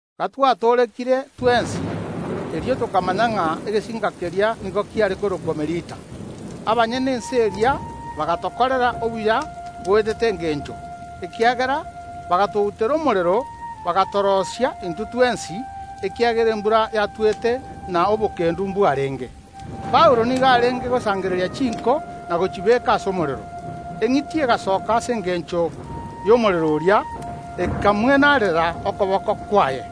Gatwatoorekire twensi, erio tokamanya ng’a egesinka keria nigo kiare korokwa Melita. Abanyene ense eria bagatokorera obuya boetete engencho, ekiagera bagatoutera omorero, bagatoroisia intwe twensi, ekiagera embura yatwete na obokendu mbwarenge. Paulo nigo arenge gosangereria chinko na gochibeka ase omorero, eng’iti egasoka ase engencho y’omorero oria, ekamwenarerera okoboko kwaye.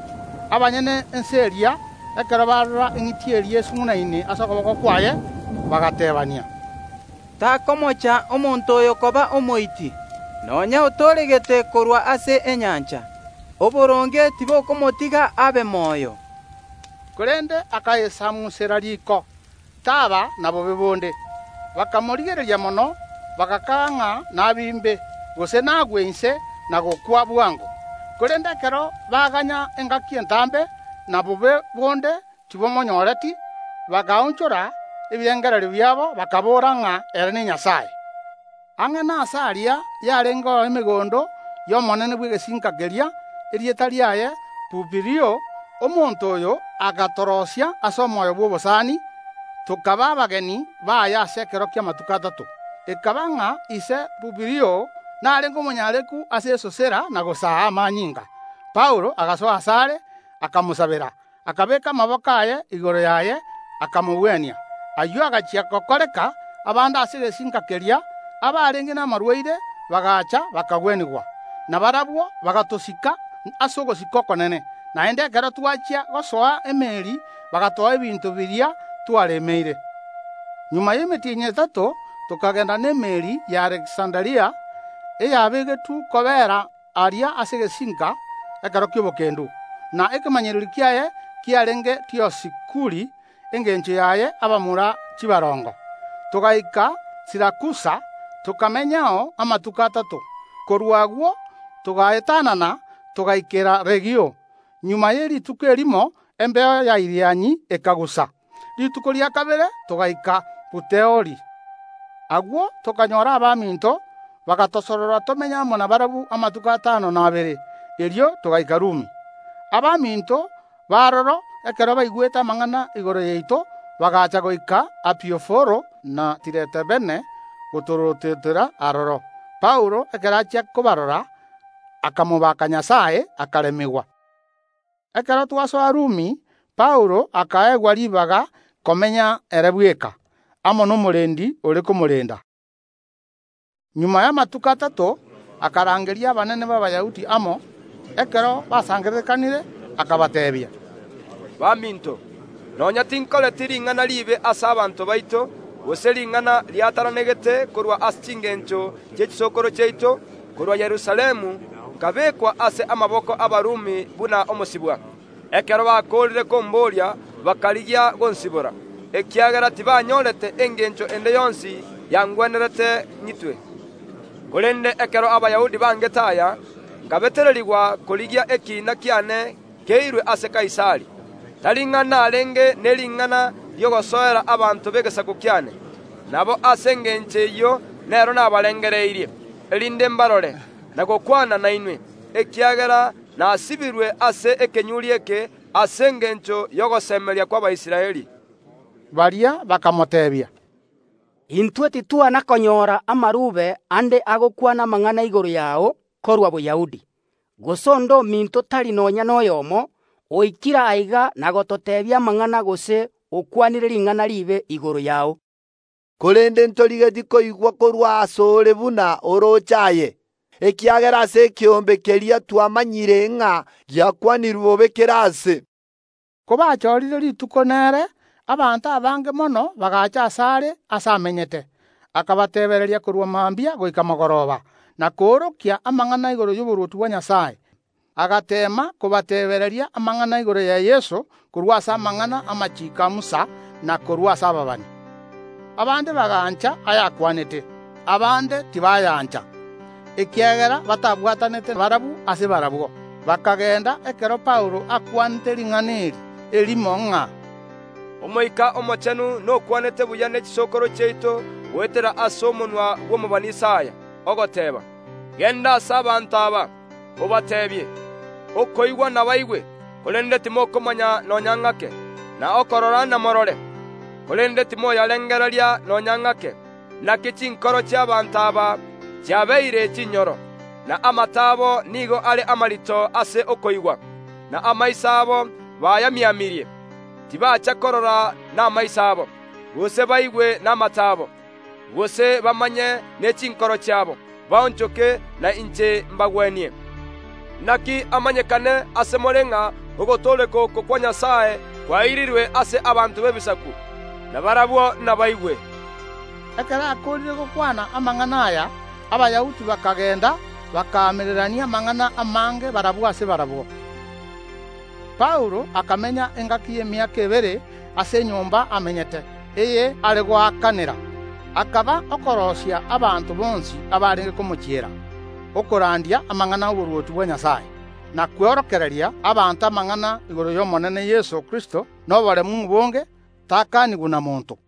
Abanyene ense eria, ekero barora eng’iti eria esung’unaine ase okoboko kwaye, bagateebania: “Takomocha omonto oyo koba omoiti, nonya otooregete korwa ase enyancha, oboronge tibokomotiga abe moyo.” Korende akayesamunsera riko, taba na bobe bonde. Bakamorigereria mono, bagakaga ng’a nabimbe, gose nagwe inse na gokwa bwango, korende ekero baganya engaki entambe, na bobe bonde tibomonyooreti, bakaonchora ebirengererio biabo, bakaboora ng’a ere nenyasae. Ang’e nase aria yarengeo emegondo y’omonene bw’egesinka keria, erieta riaye Pubilio. Omonto oyo agatoroisia ase omoyo bw’obosani, tokaba abageni baye ase ekero ki’amatuko atato. Ekaba ng’a ise Publio narenge omonyareku ase esosera na gosaa amanyinga. Paulo agasoa asare akamosabera, akabeeka amaboko aye igoro yaye, akamogwenia. Ayio agachia gokoreka, abande ase egesinka keria, abarenge namarwaire, bagacha, bakagwenigwa. Na barabwo bagatosika ase ogosika okonene; naende ekero twachia gosoa emeeri bagatoa ebinto biria twaremeire. Magega y’emetienyi etato tokagenda n’emeeri y’Aleksanderia, eyabegetwe kobeera aria ase egesinka ekero gi’etoigo, na ekemanyererio kiaye kiarenge Diosikuri (engencho yaye abamura chibarongo). Togaika Sirakusa, tokamenyao amatuko atato. Korwa agwo togaetanana, togaikera Regiumu. Magega ye rituko erimo embeo ya Irianyi ekagusa; rituko ria kabere togaika Puteoli. Agwo tokanyora abaminto, bagatosorora tomenye amo nabarabwo amatuko atano, na abere; erio togaika Rumi. Abaminto b’aroro, ekero baigwete amang’ana igoro yaito, bagacha goika Apioforo na Tiretaberne gotorototera aroro. Paulo ekero achia kobarora, akamobaka Nyasae, akaremigwa. Ekero twasoa Rumi, Paulo akaegwa ribaga komenya ere bweka, amo nomorendi ore komorenda. Magega y’amatuko atato, akarangeria abanene b’Abayahudi amo. Ekero basangererekanire akabateebia: “Baminto, nonya tinkoreti ring’ana riibe ase abanto baito, gose ring’ana riatananegete korwa ase chingencho chie chisokoro chiaito, korwa Yerusalemu nkabekwa ase amaboko ’Abarumi buna omosibwa. Ekero bakoorire komboria bakarigia gonsibora, ekiagera tibanyorete engencho ende yonsi yangwenerete ng’itwe. Korende ekero Abayahudi bangete aya, nkabetererigwa korigia ekiina kiane keirwe ase Kaisari, tari ng’a narenge ne ring’ana ri’ogosoera abanto b’egesaku kiane. Nabo ase engencho eyio nero nabarangereirie, erinde mbarore, na gokwana nainwe, ekiagera nasibirwe ase ekenyuri eke ase engencho y’ogosemeria kw’Abaisraeli.” Baria bakamoteebia: “Intwe titwana konyora amarube ande agokwana amang’ana igoro yao korwa Boyahudi, gose onde ominto tari nonya noyomo oikire aiga na gototeebia amang’ana, gose okwanire ring’ana riibe igoro yao. Korende ntorigetie koigwa korwa ase ore buna orooche aye, ekiagera ase ekeombe keria twamanyire ng’a giakwanirwe bobe kera aase.” Kobachorire rituko nere, abanto abange mono bagacha asare aase amenyete. Akabateebereria korwa mambia goika mogoroba, na koorokia amang’ana igoro y’oborwoti bwa Nyasae, agateema kobateebereria amang’ana igoro ya Yeso korwa ase amang’ana ’amachiiko a Musa na korwa ase ababani. Abande bagancha ayakwanete, abande tibayaancha. Ekiagera batabwatanete barabwo ase barabwo, bakagenda ekero Paulo akwanete ring’ana eri erimo ng’a: Omoika Omochenu nokwanete buya ne chisokoro chiaito goetera ase omonwa bw’omobani Isaya, ogoteeba, Genda ase abanto aba, obateebie: Okoigwa namoigwe, korende timokomanya nonya ng’ake, na okorora namorore, korende timoyarengereria nonya ng’ake. Naki chinkoro chi’abaanto aba chiabeire chinyoro, na amato abo nigo are amarito ase okoigwa, na amaiso abo bayamiamirie, tibacha korora namaiso abo, gose baigwe namato abo, gose bamanye ne chinkoro chiabo, baonchoke, na inche mbagwenie. Naki amanyekane ase more ng’a ogotooreka oko kwa Nyasae kwairirwe ase abanto b’Ebisaku, nabarabwo nabaigwe. [Ekero akoorire gokwana amang’ana aya, Abayahudi bakagenda, bakaamererania amang’ana amange barabwo ase barabwo.] Paulo akamenya engaki y’emiaka ebere ase enyomba amenyete, eye are goakanera, akaba okoroisia abanto bonsi abarenge komochiera, okorandia amang’ana ’oborwoti bwa Nyasae, na kworokereria abanto amang’ana igoro y’Omonene Yeso Kristo noboremu obonge, takanigwa na monto.